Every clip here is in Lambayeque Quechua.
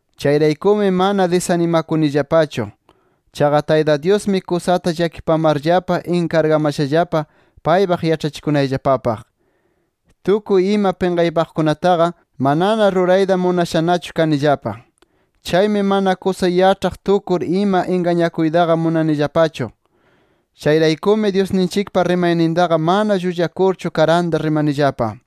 Chayraykumi mana disanimakunillapachu. Chaqa Tayta Dyusmi kusata llakipamarllapa inkargamashallapa paypaq yaĉhachikunayllapapaq. Tukuy ima pinqaypaqkunataqa, manana rurayta munashanachu kanillapa. Chaymi mana kusa yaĉhaq tukur ima ingañakuytaqa munanillapachu. Chayraykumi Dyusninchikpa rimaynintaqa mana llullakurchu, karanta rimanillapa.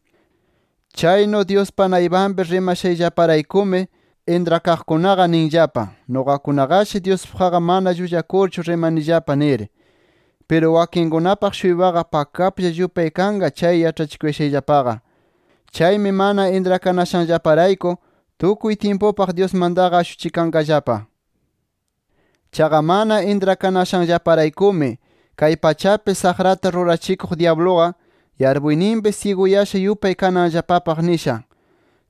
Chaynu, Dyuspa naypanpi rimashayllaparaykumi, intrakaqkunaqa ninllapa, nuqakunaqashi Dyuspaqqa mana llullakurchu rimanillapa nir. Piru wakinkunapaq-shuypaqa pakaplla yupay kanqa chay yaĉhachikushayllapaqa. Chaymi mana intrakanashanllaparayku, tukuy tyimpupaq Dyusmantaqa ashuchikanqallapa. Chaqa mana intrakanashanllaparaykumi, kay pachapi saqrata rurachikuq dyabluqa, yarpuyninpi syiguyasha yupay kananllapapaq nisha.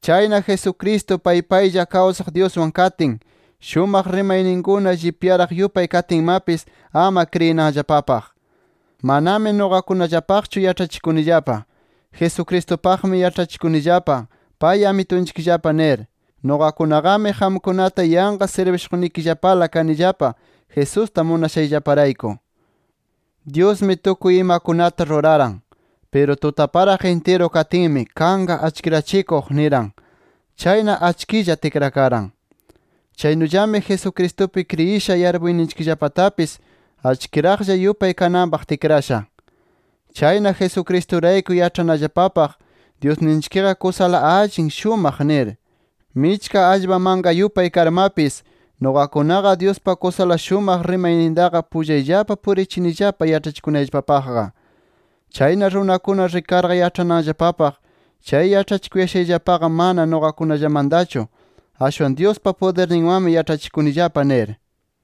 Chayna Jesucristo pay paylla kawsaq Dyuswan katin, shumaq rimayninkuna llipyaraq yupay katinmapis, ama kriyinanllapapaq. Manami nuqakunallapaqchu yaĉhachikunillapa. Jesucristupaqmi yaĉhachikunillapa, pay Amitunchikllapa nir. Nuqakunaqami qamkunata yanqa sirbishuqnikillapala kanillapa, Jesusta munashayllaparayku. Dyusmi tukuy imakunata ruraran. Piru tutaparaq intiru katinmi, “Kanqa achkirachikuq” niran. Chayna achkilla tikrakaran. Chaynullami Jesucristupi kriyisha yarpuyninchikllapatapis achkiraqlla yupay kananpaq tikrasha. Chayna Jesucristurayku yaĉhanallapapaq, Dyusninchikqa kusala allin, shumaq nir. Michka allpa manka yupay karmapis, nuqakunaqa Dyuspa kusala shumaq rimaynintaqa pullayllapa purichinillapa yaĉhachikunayllapapaqqa. Chayna runakuna rikarqa yaĉhananllapapaq chay yaĉhachikushayllapaqa mana nuqakunallamantachu, ashwan Dyuspa pudirninwanmi yaĉhachikunillapa nir.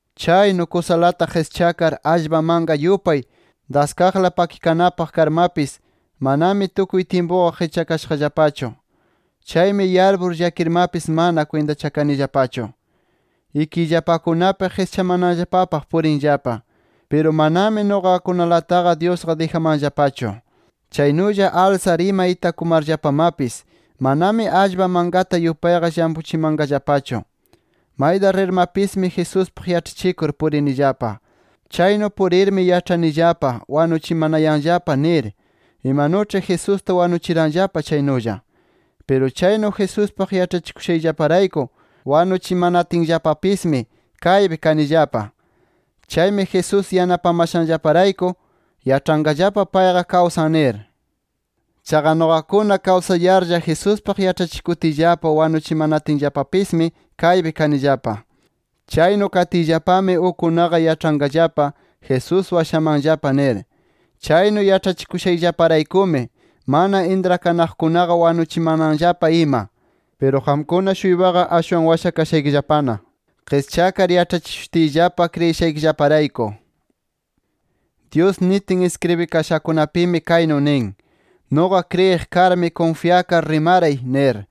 Chaynu, kusalata qischakar allpa manka yupay daskaqla pakikanapaq karmapis, manami tukuy tyimpuqa qischakashaqllapachu. Chaymi yarpur llakirmapis, mana kwintachakanillapachu. Ikiyllapakunapi qischamananllapapaq purinllapa. Piru manami nuqakunalataqa Dyusqa dijamanllapachu. Chaynulla alsar ima itakumarllapamapis, manami allpa mankata yupayqa llampuchamanqallapachu. Mayta rirmapismi Jesuspaq yaĉhachikur purinillapa. Chaynu purirmi yaĉhanillapa wanuchimanayanllapa nir, imanuĉhi Jesusta wanuchiranllapa chaynulla. Piru chaynu Jesuspaq yaĉhachikushayllaparayku wanuchimanatinllapapismi, kaypi kanillapa. Chaymi Jesús yanapamashanllaparayku, yaĉhanqallapa payqa kawsan nir. Chaqa nuqakuna kawsayarlla Jesuspaq yaĉhachikutiyllapa wanuchimanatinllapapismi, kaypi kanillapa. Chaynu katiyllapami, ukkunaqa yaĉhanqallapa Jesús washamanllapa nir. Chaynu yaĉhachikushayllaparaykumi mana intrakanaqkunaqa, wanuchimananllapa ima. Piru qamkuna-shuypaqa ashwan washakashaykillapana, qischakar yaĉhachishutiyllapa kriyishaykillaparayku. Dyus nitin iskribikashakunapimi kaynu nin: “Nuqa kriyiq karmi, kunfyakar rimaray” nir.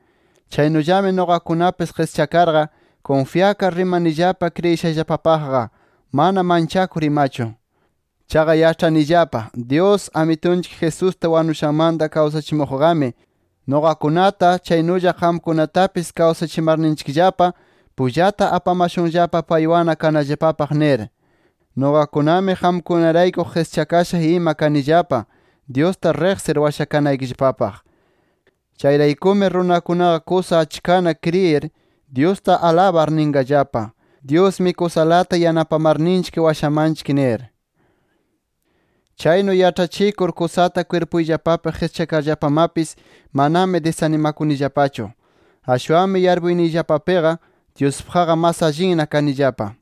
Chaynullami nuqakunapis qischakarqa, kunfyakar rimanillapa kriyishayllapapaqqa, mana manchakur imachu. Chaqa yaĉhanillapa Dyus, Amitunchik Jesusta wanushanmanta kawsachimuqqami nuqakunata, chaynulla qamkunatapis kawsachimarninchikllapa, pullata apamashunllapa paywanna kanallapapaq nir. Nuqakunami qamkunarayku qischakasha ima kanillapa, Dyusta riqsir washakanaykillapapaq. Chayraykumi runakunaqa kusa achkana kriyir, Dyusta alabar ninqallapa: Dyusmi kusalata yanapamarninchik washamanchik nir. Chaynu yaĉhachikur kusata kwirpuyllapapi qischakarllapamapis, manami disanimakunillapachu. Ashwanmi yarpuyniyllapapiqa, Dyuspaqqa mas allinna kanillapa.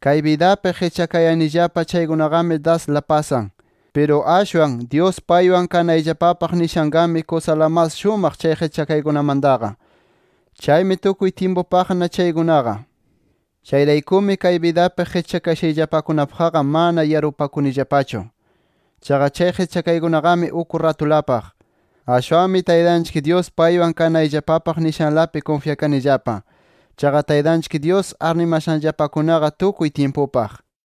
Kay bidapi qischakayanillapa chaykunaqami dasla pasan. Piru ashwan Dyus paywan kanayllapapaq nishanqami, kusala mas shumaq chay qischakaykunamantaqa. Chaymi tukuy tyimpupaqna chaykunaqa. Chayraykumi kay bidapi qischakashayllapakunapaqqa mana yarpupakunillapachu. Chaqa chay qischakaykunaqami uk ratulapaq. Ashwanmi Taytanchik Dyus paywan kanayllapapaq nishanlapi kunfyakanillapa. Chaqa Taytanchik Dyus arnimashanllapakunaqa tukuy tyimpupaq.